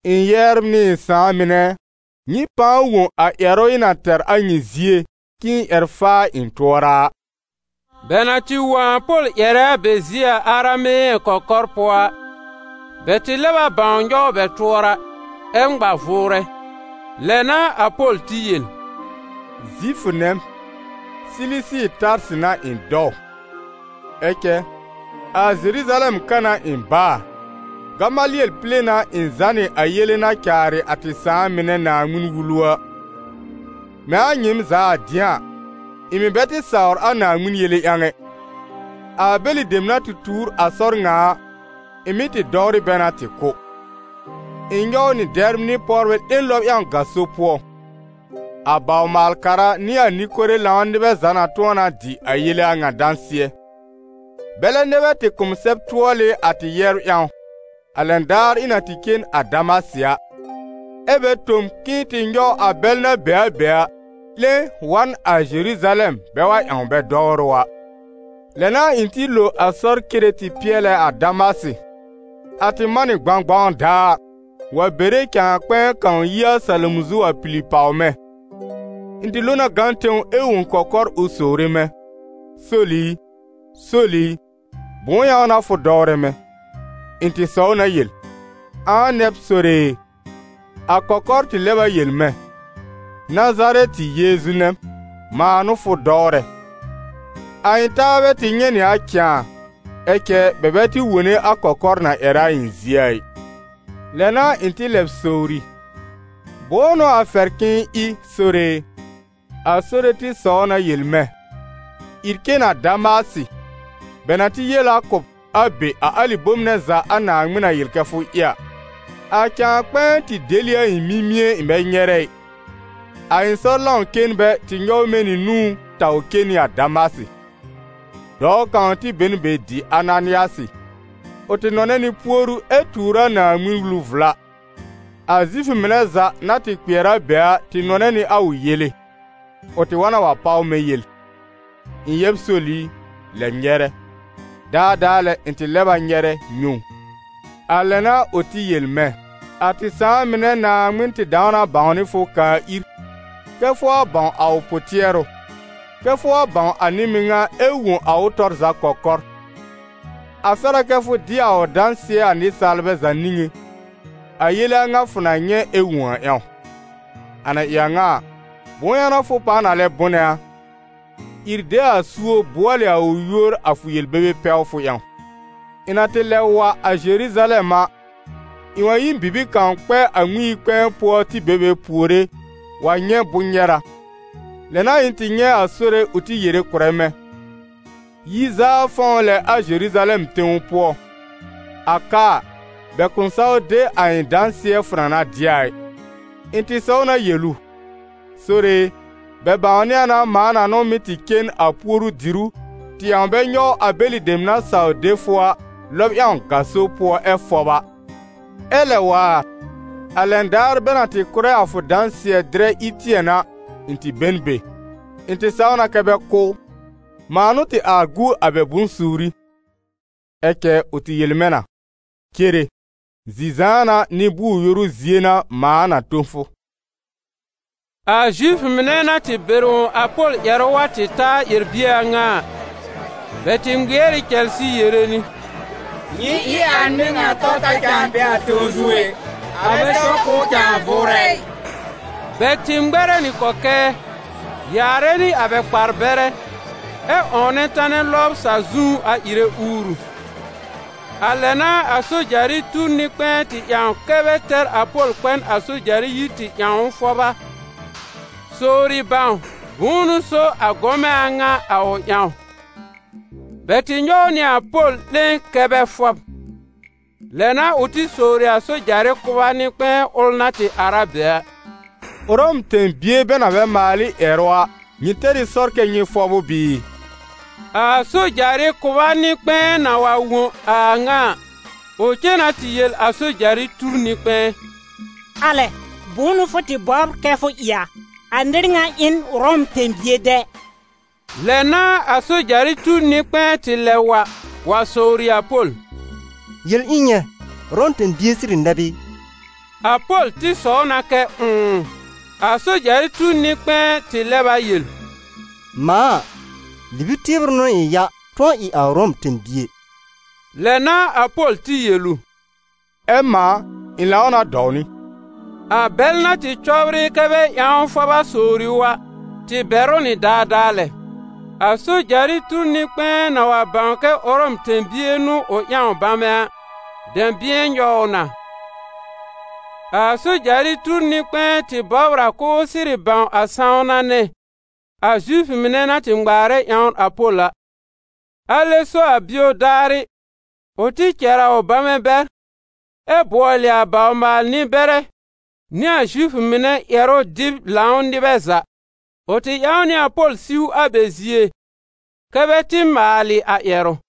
«Ɩ̃ yɛbr nɩ ɩ̃ sãà mɩnɛ ɛ, nyɩ pãa wõ a ƴɛrʋ ɩ̃ na tɛr a nyɩ zie, k'ɩ̃ɩ ƴɛr faa ɩ̃ tʋɔra a.» Bɛ na tɩ wõ a Pol ƴɛrɛ a bɛ zie a arameyɛ̃ kɔkɔr pʋɔ a, bɛ tɩ lɛb a bãw nyɔw bɛ tʋɔra ɛ ŋma vʋʋrɛ. Lɛ n'a a Pol tɩ yel: «Zifʋ nɛ m, Silisi Tarsɩ n'a ɩ̃ dɔw. Ɛ cɛ a Zeruzalɛm ka n'a ɩ̃ baa, Gamalɩɛl pile n'a ɩ̃ zànɩ a yele na caarɩ a tɩ sãà mɩnɛ Naaŋmɩn-Wulu a. Mɛ̃ a nyɩɩm za a dɩ̃a a, ɩ̃ mɩ̀ bɛ tɩ sawr a Naaŋmɩn yele ƴãw ɛ. A bɛlɩ dem na tuur a sɔr ŋa a, ɩ̃ mɩ́ tɩ dɔwrɩ bɛ na tɩ kʋ́. Ɩ̃ nyɔw nɩ dɛbr nɩ pɔwbɛ 'lẽ lɔb ƴãw gaso pʋɔ. A bawr-maal-kara nɩ a nɩ-kore-lãw nɩbɛ za na tʋ̃ɔ na dɩ a yele a ŋa dãsɩɛ. Bɛlɛ nɛ bɛ tɩ kʋ̀ m sɛb-tʋɔlɩ a tɩ yɛbr ƴãw, a lɛn daar ɩ̃ na tɩ cen a Damasɩ a; ɛ́ bɛ tõ m k'ɩ̃ɩ tɩ nyɔw a bɛl na be a be a, 'lẽ wa n a Zeruzalɛm bɛ wa ƴãw bɛ dɔwrʋ a.» «Lɛ n'a ɩ̃ tɩ lo a sɔr cere tɩ pɩɛlɛ a Damasɩ. A tɩ man nɩ gbãgbaw daar, wa bere cãa kpɛ̃ɛ kãw yi a salom zu wa pili pàw mɛ̃. Ɩ̃ tɩ lo na gã tẽw ɛ wõ kɔkɔr ʋ sowre mɛ̃: ‹Sol i, Sol i, bʋ̃ʋ ƴãw n'a fʋ dɔwrɛ mɛ̃?› Ɩ̃ tɩ sɔw na yel: ‹Ãa nɛ b, Sore e?› A kɔkɔr tɩ lɛb a yel mɛ̃: ‹Nazarɛtɩ Yeezu nɛ m, mãa n'ʋ fʋ dɔwrɛ.› A ɩ̃ taabɛ tɩ nyɛ̃ nɩ a cãa, ɛ cɛ bɛ bɛ tɩ wone a kɔkɔr na ƴɛrɛ a ɩ̃ zie a ɩ. Lɛ n'a ɩ̃ tɩ lɛb sowri: ‹Bʋ̃ʋ n'ʋ a fɛr k'ɩ̃ɩ ɩ, Sore e?› A Sore tɩ sɔw na yel mɛ̃: ‹Ìr cen a Damasɩ, bɛ na tɩ yel a kʋ̀ b a be a alɩ bome nɛ za a Naaŋmɩn na yel kɛ fʋ ɩ a.› A cãa kpɛ̃ɛ tɩ del ɩ a ɩ̃ mimie ɩ̃ bɛ nyɛrɛ ɩ. A ɩ̃ sɔr lãw-cenbɛ tɩ nyɔw mɛ̃ nɩ nũú taw cen nɩ a Damasɩ.» «Dɔɔ kãw tɩ be n be dɩ Ananɩasɩ. Ʋ tɩ nɔnɛ nɩ puoru ɛ tuur a Naaŋmɩn-Wulu vla. A Zifʋ mɩnɛ za na tɩ kpɩɛr a be a tɩ nɔnɛ nɩ a ʋ yele. Ʋ tɩ wa na wa páw mɛ̃ yel: ‹Ɩ̃ yɛb Sol i, lɛb nyɛrɛ!› Daadaa lɛ ɩ̃ tɩ lɛb a nyɛrɛ, nyɛ̃ ʋ. A lɛ n'a ʋ tɩ yel mɛ̃: ‹A tɩ sãà mɩnɛ Naaŋmɩn tɩ dãw na bãwnɩ fʋ kaa ir, kɛ́ fʋ wa bãw a ʋ pʋ-tɩɛrʋ, kɛ́ fʋ wa bãw a nɩ-mɩŋa ɛ wõ a ʋ tɔr za kɔkɔr. A fɛr a kɛ́ fʋ dɩ a ʋ dãsɩɛ a nɩsaalbɛ za niŋé, a yele a ŋa fʋ na nyɛ̃ ɛ wõ a ƴãw. A na ɩ a ŋa a, bʋ̃ʋ ƴãw n'a fʋ pãa na lɛ bʋnɛ a? Ìr de a suob bʋɔlɩ a ʋ yúor a fʋ yel-bebe pɛwfʋ ƴãw.›» «Ɩ̃ na tɩ lɛb wa a Zeruzalɛm a, ɩ̃ wa yi n bibir kãw kpɛ a Ŋmɩn-yi-kpɛ̃ɛ pʋɔ tɩ be be puore wa nyɛ̃ bʋ̃-nyɛra. Lɛ n'a ɩ̃ tɩ nyɛ̃ a Sore ʋ tɩ yere kʋ̀rɛ mɛ̃: ‹Yi zaa fɔ̃w lɛ a Zeruzalɛm tẽw pʋɔ. A ka a, bɛ kʋ̃ saw de a ɩ̃ dãsɩɛ fʋ na na dɩ a ɩ.› Ɩ̃ tɩ sɔw na yel ʋ: ‹Sore e, bɛ bãwnɩ a na mãa na n'ʋ mɩ́ tɩ cen a puoru-dìrú, tɩ ƴãw bɛ nyɔw a bɛlɩ dem na saw de fʋ a, lɔb ƴãw gaso pʋɔ ɛ fɔb a. Ɛ lɛ waar, a lɛn daar bɛ na tɩ kʋ́rɛ a fʋ dãsɩɛ-dɩrɛ Ɩtɩɛn a, ɩ̃ tɩ be n be, ɩ̃ tɩ saw na kɛ́ bɛ kʋ́ ʋ. Mãa n'ʋ tɩ ar gu a bɛ bʋ̃-suuri.› Ɛ cɛ ʋ tɩ yel mɛ̃ na: ‹Cere, zi-zãana, nɩ-bʋʋr-yoru zie n'a mãa na tõ fʋ.›» A Zifʋ mɩnɛ na tɩ bɛr wõ a Pol ƴɛrʋ wa tɩ ta a ƴɛr-bie a ŋa a, bɛ tɩ ŋmɩɛr ɩ cɛlsɩ yere nɩ: «Nyɩ ɩ a nɩr ŋa tɔ ta cãa a tẽw zu ɛ! A bɛ sɛw k'ʋʋ cãa vʋʋrɛ ɩ!» Bɛ tɩ ŋmɛrɛ nɩ kɔkɛɛ, yaarɛ nɩ a bɛ kpar-bɛrɛ, ɛ 'wɔ̃wnɛ tanɛ lɔbr sa-zu a ɩrɛ uuru. A lɛ n'a a sojarɩ tur nɩ-kpɛ̃ɛ tɩ ƴãw kɛ́ bɛ tɛr a Pol kpɛ n a sojarɩ yir tɩ ƴãw ʋ fʋba, sowri bãw bʋ̃ʋ n'ʋ so a gɔmɛ a ŋa a ʋ ƴãw. Bɛ tɩ nyɔw nɩ a Pol 'lẽ kɛ́ bɛ fɔb. Lɛ n'a ʋ tɩ sowri a sojarɩ kʋba nɩ-kpɛ̃ɛ ʋl na tɩ ar a be a: «Ʋrɔm tẽ-bie bɛ na bɛ maal ɩ ƴɛrʋ a, nyɩ tɛr ɩ sɔr kɛ́ nyɩ fɔb ʋ bɩɩ?» A sojarɩ kʋba nɩ-kpɛ̃ɛ na wa wõ a a ŋa a, ʋ cen na tɩ yel a sojarɩ tur nɩ-kpɛ̃ɛ: «Alɛ! bʋ̃ʋ n'ʋ fʋ tɩ bɔbr kɛ fʋ ɩ a? A nɩr ŋa ɩ n Ʋrɔm tẽ-bie dɛ!» Lɛ n'a a sojarɩ tur nɩ-kpɛ̃ɛ tɩ lɛb wa wa sowri a Pol: «Yel ɩ̃ nyɛ̃, Ʋrɔm tẽ-bie sɩrɩ nɛ b ɩ?» A Pol tɩ sɔw na kɛ ʋ̃ʋ. A sojarɩ tur nɩ-kpɛ̃ɛ tɩ lɛb a yel: «Mãa a, libi-tɩbrʋ n'ʋ ɩ̃ ya tʋ̃ɔ ɩ a Ʋrɔm tẽ-bie.» Lɛ n'a a Pol tɩ yel ʋ: «Ɛ mãa, ɩ̃ lãw na dɔw nɩ.» A bɛl na tɩ cɔbr ɩ kɛ́ bɛ ƴãw ʋ a fʋba sowri ʋ a, tɩ bɛr ʋ nɩ daadaa lɛ. A sojarɩ tur nɩ-kpɛ̃ɛ na wa bãw kɛ Ʋrɔm tẽ-bie n'ʋ ʋ ƴãw bamɛ a, dɛ̃bɩ̃ɛ nyɔw ʋ na. A sojarɩ tur nɩ-kpɛ̃ɛ tɩ bɔbr a k'ʋʋ sɩrɩ bãw a sãwna nɛ a Zifʋ mɩnɛ na tɩ ŋmaarɛ ƴãwn a Pol a. Alɛ so a bio daarɩ ʋ tɩ cɛr a ʋ bamɛ bɛr, ɛ bʋɔlɩ a bawr-maal-nɩ-bɛrɛ nɩ a Zifʋ mɩnɛ ƴɛrʋ-dɩb-lãw nɩbɛ za. Ʋ tɩ ƴãw nɩ a Pol siw a bɛ zie kɛ́ bɛ tɩ maalɩ a ƴɛrʋ.